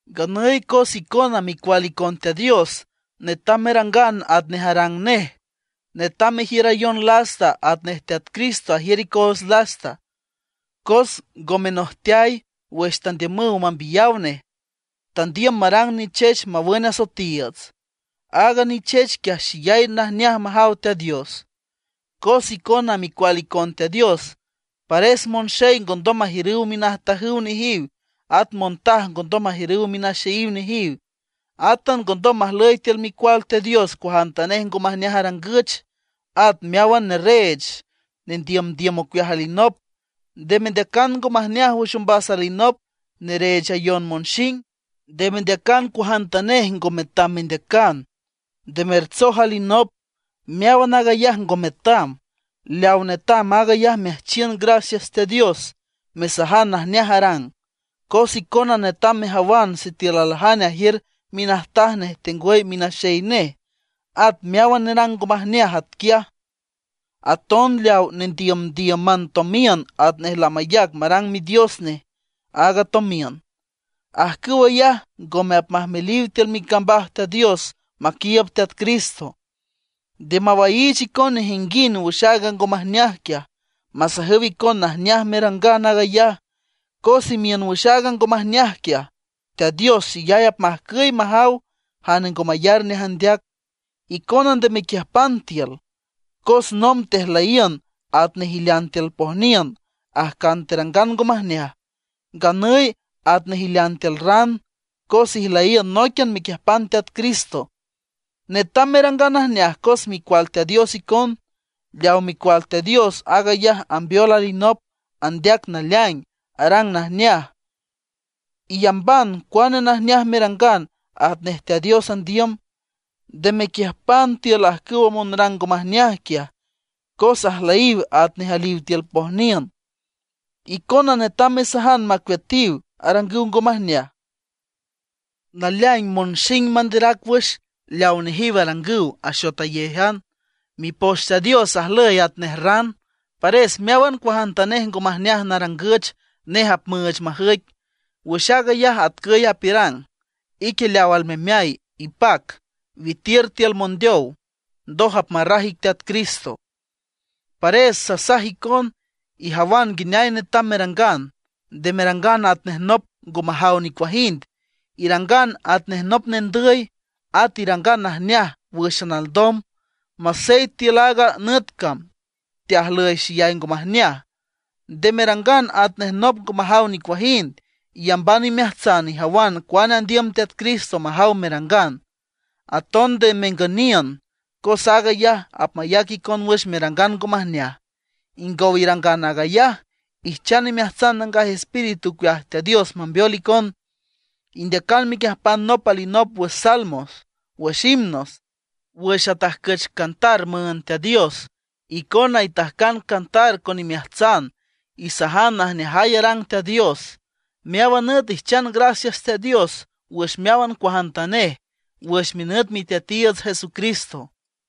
Nganüy cos icona micual icon Teat Dios, netam merangan atnej arang nej. Netam merjiürayon lasta atnej Teat Cristo ajiür icoots lasta, cos ngo menojteay wüx tandiümüw mambiyaw nej; tandiüm marang nichech mawün asoetiiüts. Aaga nichech quiaj xeyay najneaj majaw Teat Dios. Cos icona micual icon Teat Dios, pares monxey ngondom majiürüw minajtajüw nejiw, at montaj ngondom majiürüw minaxeyiw nejiw. Átan ngondom majlüy tiül micual Teat Dios cuajantanej ngo majneaj arangüch, at meáwan nerreech, nendiümdiüm ocueaj alinop. Nde mendeacan ngo majneaj wüx ombas alinop mereechayon monxing. Nde mendeacan cuajantanej ngo metam mendeacan; nde mertsoj alinop. Meáwan aag ayaj ngo metam; leaw netam aag ayaj meajchiün gracias Teat Dios, mesajan najneaj arang. Cos icona netam mejawan sitiül aljane ajiür minajtaj nej tengwüy minaxey nej, at meáwan nerang ngo majneaj atquiaj; aton leawa nendiümdíüman tomiün atnej lamayac marang midios nej a tomiün. Ajcüw ayaj ngome apmajmeliw tiül micambaj Teat Dios maquiiüb Teat Cristo. Nde mawaiich icon nejinguind wüx aaga ngo majneaj quiaj, masajüw icon najneaj merangan aag ayaj. Cos imiün wüx aaga ngo majneaj quiaj, Teat Dios xeyay apmajcüy majaw jane ngo mayar nej andeac. Icona nde mequiüjpan tiül. Cos nomb tejlüyiün atnej ilean tiül pojniün, ajcan terangan ngo majneaj, nganüy atnej ilean tiül ran, cos ijlüyiün nóiquian mequiüjpan Teat Cristo. Netam merangan najneaj cos micual Teat Dios icon. Leawa micual Teat Dios, aag ayaj ambeol alinop, andeac naleaing, arang najneaj. Iyamban cuane najneaj merangan atnej Teat Dios andiüm. Nde mequiüjpan tiül ajcüwa monrang ngo majneaj quiaj, cos ajlüyiw atnej aliw tiül pojniün. Icona netam mesajan macueatiw arangüw ngo majneaj. Naleaing monxing manderac wüx leawa nejiw arangüw axotayéjan. Mipoch Teat Dios ajlüy atnej ran; pares meáwan cuajantanej ngo majneaj narangüch, nej apmüüch majüic. Wüx aag ayaj atcüy apiürang: Ique leaw almemeay, ipac, witiür tiül mondeow, ndoj apmarraj ic Teat Cristo. Pares sasaj icon, ijawan nguineay netam merangan; nde merangan atnej nop ngo majaw nicuajind, irangan atnej nop nendüy. At irangan najneaj wǘxan alndom, masey tiül aaga nüt cam teajlüy xeyay ngo majneaj. Nde merangan atnej nop ngo majaw nicuajind, iyamban imeajtsan ijawan cuane andiüm Teat Cristo majaw merangan. Aton nde mengüniün, cos aag ayaj apmayac icon wüx merangan ngo majneaj. Ingow irangan aag ayaj, ijchan imeajtsan Nangaj Espíritu ocueaj Teat Dios mambeol icon. Indeacan mequiüjpan nop alinop wüx salmos, wüx himnos, wüx atajcüch cantar müünd Teat Dios. Icona itajcan cantar con imeajtsan; isajan najneajay arang Teat Dios. Meáwan nüt ijchan gracias Teat Dios wüx meáwan cuajantanej, wüx minüt Miteatiiüts Jesucristo.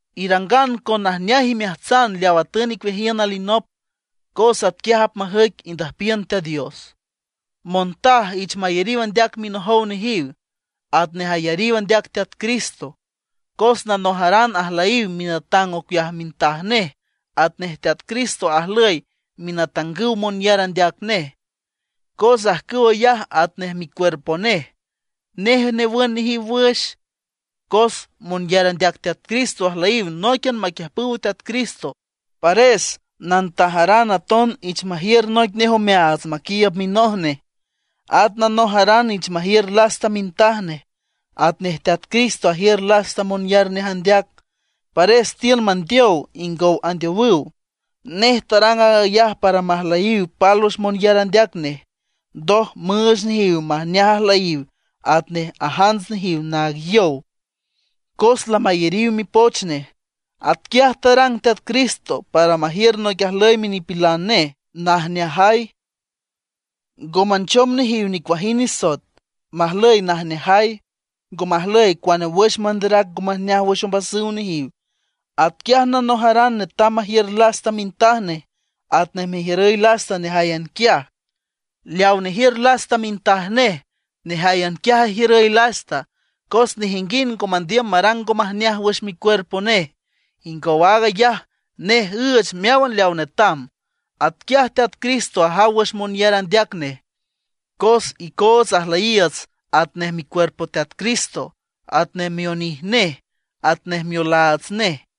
Irangan con najneaj imeajtsan leaw atün icueajiün alinop, cos atquiaj apmajüic indüjpiün Teat Dios. Montaj ich mayariw andeac minojow nejiw, atnej ayariw andeac Teat Cristo. Cos nanojaran ajlüy minatang ocueaj mintaj nej atnej Teat Cristo ajlüy minatangüw monyar andeac nej, cos ajcüw ayaj atnej micuerpo nej, nej newün nejiw wüx. Cos monyar andeac Teat Cristo ajlüyiw nóiquian maquiüjpüw Teat Cristo, pares nantajaran aton ich majiür noic nej omeaats maquiiüb minoj nej. At nanojaran ich majiür lasta mintaj nej, atnej Teat Cristo ajiür lasta monyar nej andeac, pares tiün mandeow ingow andeowüw. Nej tarang aag ayaj para majlüyiw pálwüx monyar andeac nej, ndoj müüch nejiw majneaj ajlüyiw atnej ajants nejiw naag yow, cos lamayariw mipoch nej. Atquiaj tarang Teat Cristo para majiür noic ajlüy minipilan nej najneajay, ngo manchom nejiw nicuajind nisoet, majlüy najneajay, ngo majlüy cuane wüx manderac ngo majneaj wüx ombasüw nejiw. Atquiaj nanojaran netam majiür lasta mintaj nej, atnej mejiürüy lasta nejáyan quiaj. Leaw nejiür lasta mintaj nej, nejáyan quiaj ajiürüy lasta. Cos nejinguind ngo mandiüm marang ngo majneaj wüx micuerpo nej, ingow aag ayaj nej üüch meáwan leaw netam. Atquiaj Teat Cristo ajaw wüx monyar andeac nej. Cos icoots ajlüyiiüts atnej micuerpo Teat Cristo, atnej mionij nej atnej miolaats nej.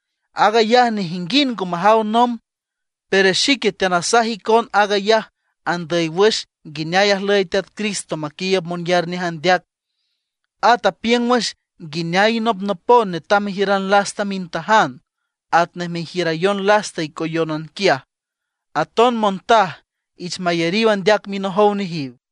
Aag ayaj nejinguind ngo majaw nomb, pero xique teanasaj icon aag ayaj andüy wüx nguineay ajlüy Teat Cristo maquiiüb monyar nej andeac. At apiüng wüx nguineay inopnopon netam mejiüran lasta mintajan, atnej merjiürayon lasta icoyónan quiaj. Aton montaj ich mayariw andeac minojow nejiw.